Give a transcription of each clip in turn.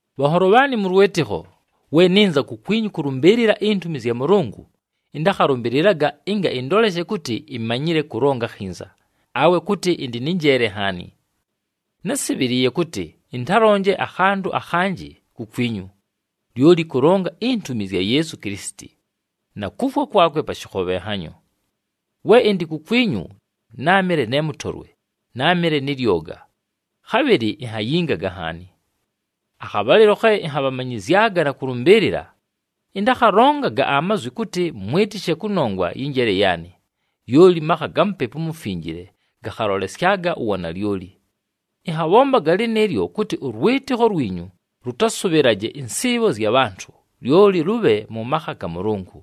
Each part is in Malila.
Bhanholo bhaanɨ mʉ lwɨtɨkho, we nɨnza kukwinyu kʉlʉmbɨɨlɨla intumi zya Mʉlʉngʉ, ɨntakhalʉmbɨlɨlaga ɨnga ɨndoleshe kʉtɨ imanyile kʉlonga akhinza, awe kʉtɨ ɨndɨ nɨ njeele nhaani. Násɨbhɨlɨɨye kʉtɨ ɨntalonje akhantʉ akhanjɨ kukwinyu, lyoli kʉlonga intumi zya Yeesu Kilisiti, na kufwa kwakwe pa shɨkhobhenhanyo. We ɨndɨ kukwinyu, náamɨle ne mʉtolwe, náamɨle nɨ lyoga, khabhɨlɨ inhayingaga nhaani. Akhabhalɨlo khe ɨnhabhamanyɨzyaga na kʉlʉmbɨɨlɨla, ɨntakhalongaga amazwi kʉtɨ mwɨtɨshe kʉnongwa yɨ njeele yaanɨ, lyoli makha ga Mupepu uMufinjile gakhalolesyaga uwanalyoli. Ɨnhabhombaga lɨnɨɨlyo, kʉtɨ ʉlwɨtɨkho lwinyu lʉtasʉbhɨlaje ɨnsɨɨbho zya bhantʉ, lyoli lʉbhe mʉ makha ga Mʉlʉngʉ.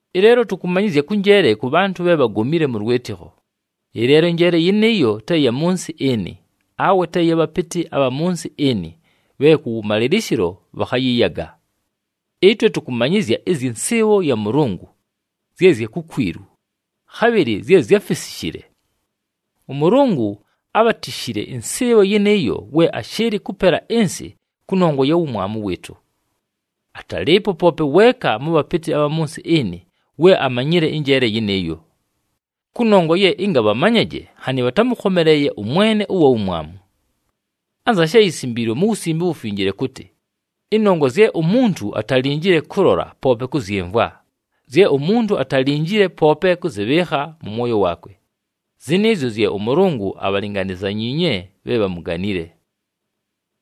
Ɨleelo tʉkʉmanyɨzya kʉ njeele kʉ bhantʉ bhe bhagomile mʉ lwɨtɨkho, ɨleelo ɨnjeele yɨnɨɨyo te ya mʉ nsɨ ɨnɨ, awe te ya bhapɨtɨ abha mʉ nsɨ ɨnɨ bhe kʉwʉmalɨlɨshɨlo bhakhayɨyaga. Ɨtwe tʉkʉmanyɨzya ɨzyɨ nsɨɨbho ya Mʉlʉngʉ, zye zya kukwilu, khabhɨlɨ zye zyáfisishile. ɄMʉlʉngʉ ábhatishile ɨnsɨɨbho yɨnɨɨyo we ashɨɨlɨ kʉpela ɨnsɨ kʉnongwa ya wumwamu wɨɨtʉ. Atalɨɨpo poope weeka mʉ bhapɨtɨ abha mʉ nsɨ ɨnɨ we amanyile ɨnjeele yɨnɨɨyo. Kʉnongwa ye ɨnga bhamanyaje nhanɨ bhatámʉkhomeleeye ʉMwene ʉwa wumwamu. Anza she yisimbiilwe mu Wusimbe uWufinjile kʉtɨ, “Ɨnongwa zye umuntu atalinjile kʉlola, poope kʉzyɨmvwa, zye umuntu atalinjile poope kʉzɨbhɨɨkha mʉ mwoyo waakwe, zɨnɨɨzyo zye ʉMʉlʉngʉ abhalinganizanyiinye bhe bhamuganile.”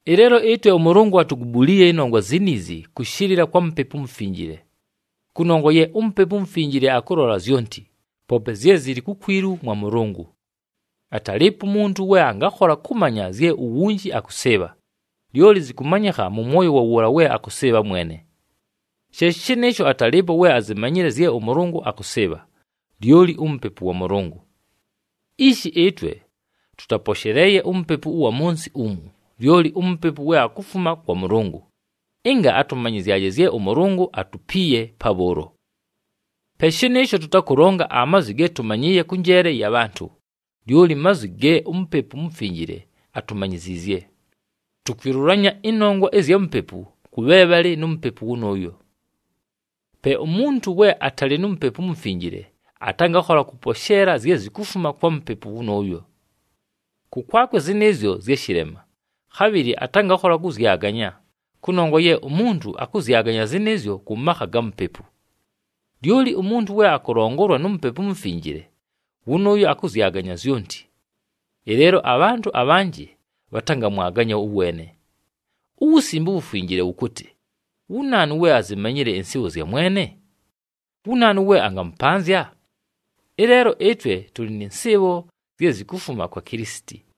Ɨleelo ɨtwe ʉMʉlʉngʉ atugubuliiye ɨnongwa ziniizi kʉshɨlɨla kwa Mupepu uMufinjile. Kʉnongwa ye uMupepu uMufinjile akʉlola zyonti, poope zye zɨlɨ kukwilu mwa Mʉlʉngʉ. Atalɨɨpo umuntu we angakhola kʉmanya zye uwunji akʉsɨɨbha, lyoli zɨkʉmanyɨkha mʉ mwoyo wa wʉʉla we akʉsɨɨbha mwene. She shɨnɨɨsho, atalɨɨpo we azimanyile zye ʉMʉlʉngʉ akʉsɨɨbha, lyoli uMupepu wa Mʉlʉngʉ. Ishi ɨtwe, tʉtaposheleeye umupepu ʉwa mʉ nsɨ umu, lyoli uMupepu we akufuma kwa Mʉlʉngʉ, ɨnga atʉmanyɨzyaje zye ʉMʉlʉngʉ atupiiye pabhʉʉlo. Pe shɨnɨɨsho, tʉtakʉlonga amazwi ge tʉmanyɨɨye kʉ njeele ya bhantʉ, lyoli mazwi ge uMupepu uMufinjile atumanyiziizye. Tukwilulanya ɨnongwa ɨzya Mupepu kʉ bhe bhalɨ nu Mupepu wʉnʉʉyo. Pe umuntu we atalɨ nu Mupepu uMufinjile, atangakhola kʉposheela zye zikufuma kwa Mupepu wʉnʉʉyo. Kʉkwakwe zɨnɨɨzyo zya shɨlema, khabhɨlɨ atangakhola kʉzyaganya, kʉnongwa ye umuntu akʉzyaganya zɨnɨɨzyo kʉ makha ga Mupepu. Lyoli umuntu we akʉlongolwa nu Mupepu uMufinjile, wʉnʉʉyo akʉzyaganya zyonti. Ɨleelo abhantʉ abhanjɨ bhatangamwaganya ʉweene. UWusimbe uWufinjile wʉkʉtɨ, “Wu naanu we azimanyile ɨnsɨɨbho zya Mwene? Wu naanu we angamʉpanzya?” Ɨleelo ɨtwe tʉlɨ nɨ nsɨɨbho zye zikufuma kwa Kilisiti.